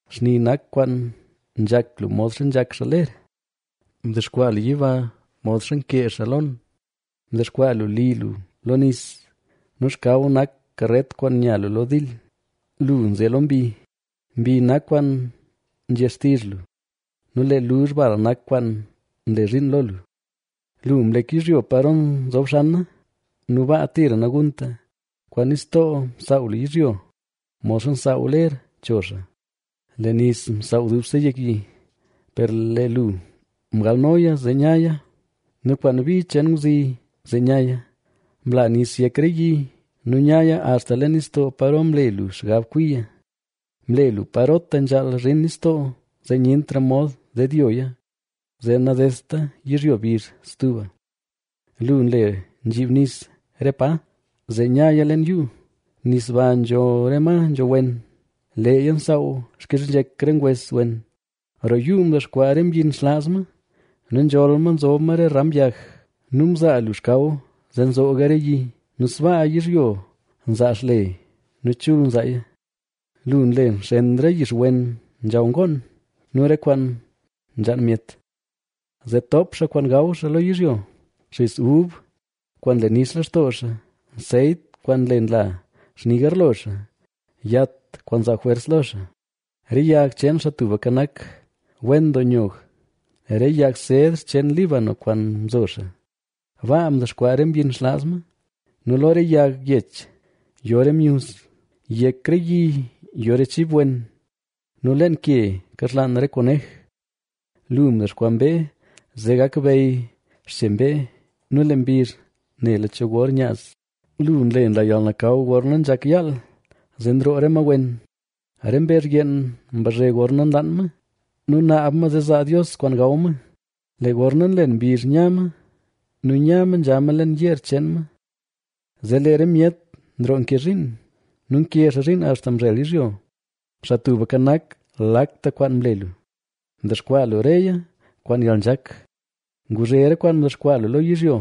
Xni nak kwaan nzhak lu modxa nzhak xaa ler; mdexkwaa lu yiba modxa nkee xaa lon. Mdexkwaa lu li lu lo nis nu xkaw nak karet kwaan nya lu lo dil, lu nze lo mbi. Mbi nak kwaan nzhe xtizh lu nu lee luzh bal nak kwaan nle zhiin lo lu. Lu mlek yizhyo paro nzob xana nu baa tira nagunta. Kwaan nistoo msaaw lu yizhyo, modxa nsaaw ler cho xaa; lee nis msaaw dubse yek yi. Per lee lu mgalnoya zee nyaya nu kwaan bi cheen ngwzi zee nyaya. Mla nis yek re yi nu mlaya axta leen yuu nu nyaya axta leen nistoo paro mle lu xgab kwiya. Mle lu parota nzhaal zhin nistoo zee nyentra mod dedyoya, zee nadedta yizhyo bizh stuba. Lu nle nzhiib nis re pa, zee nyaya leen yuu. Nis ba nzho re ma nzho wen; leeya nsaaw xkizhnzhek re ngwes wen. Roo yuu ndexkwaa re myin xlaaz ma nu nzholl ma zob ma re ram yag. Nu mzaa lu xkaw zee nzooga re yi; nu sbaa yizhyo nzaa xle nu chul nzaaya. Lu nle nxen re yixwen nzhaw ngoon nu re kwaan nzhaan myet, zee toop xaa kwaan gaw xaa lo yizhyo: xis ub kwaan nle nix lextoo xaa, nseyt kwaan nle nla xni garlo xaa, yat kwaan nzaa jwers lo xaa. Re yag cheen Xaa Tubka Nak, wen doo nyog, re yag sedr cheen Líbano kwaan mzo xaa. Baa dexkwaa re myin xlaaz ma, nu lo re yag yech yo re myuz. Yek re yi yo re chib wen nu leen ke nkaxlaan re konej. Lu mdexkwaa mbee zee gak bey xche mbee nu lee mbizh nela cho gor nyaaz. Lu nle nla yalnakaw gorna nzhak yaal, zee nroo re ma wen. Re mbezh yeen mbazhe gorna nlaan ma, nu naab ma zee zaa Dios kwaan gaw ma. Lee gorna nlen mbizh nya ma nu nya ma nzha ma leen yeer cheen ma. Zee lee re myet nroo nke zhiin nu nke xaa zhiin axta mzhel yizhyo. ¡Xaa Tubka Nak, lakta kwaan mle lu, mdexkwaa lu reya kwaan yalnzhak; nguzhe re kwaan mdexkwaa lu lo yizhyo!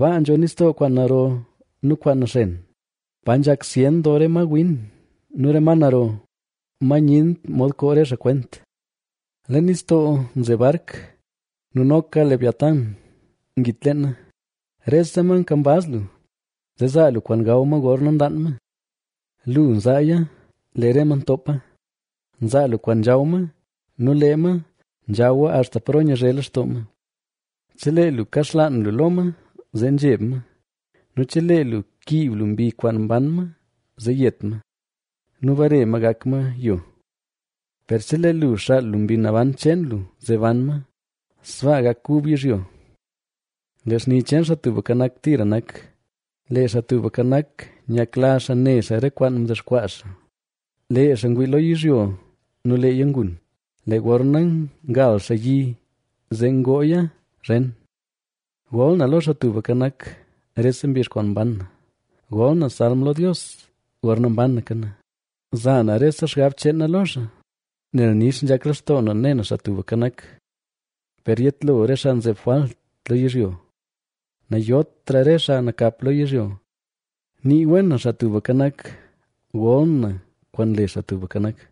Baa nzho nistoo kwaan naro nu kwaan naxen, pa nzhak zyen doo re ma win nu re ma naro, ma nyent mod koo re xaa kwent. Leen nistoo nze bark nu noka Leviatána ngit leena. Rese ma nkambaz lu, zee zaa lu kwaan gaw ma gorna nlaan ma. Lu nzaaya, lee re ma ntoopa; nzaa lu kwaan nzhaw ma nu lee ma nzhawa axta paro nyazhe lextoo ma. Chelee lu kaxlaan lu lo ma zee nzheb ma nu chelee lu kiib lu mbi kwaan mban ma zee yet ma nu bare ma gak ma yo. Per chelee lu xaal lu Mbi Naban cheen lu zee ban ma, sbaa gak kub yizhyo. Lee xni cheen Xaa Tubka Nak tira nak. Lee Xaa Tubka Nak, nyakla xaa ne xaa re kwaan mdexkwaa xaa. Lee xaa ngwii lo yizhyo nu leeya ngun; lee gorna ngal xaa yi zee ngooya zhen. Gol na lo Xaa Tubka Nak rese mbizh kwaan mban na; gol na salm lo Dios gorna mbanaka na. Za na rese xgab cheen na lo xaa, nel nix nzhak lextoo na ne na Xaa Tubka Nak. Per yetlo re xaa nzeb jwalt lo yizhyo, nayotra re xaa nakap lo yizhyo. ¡Nii wen na Xaa Tubka Nak! ¡Gol na kwaan le Xaa Tubka Nak!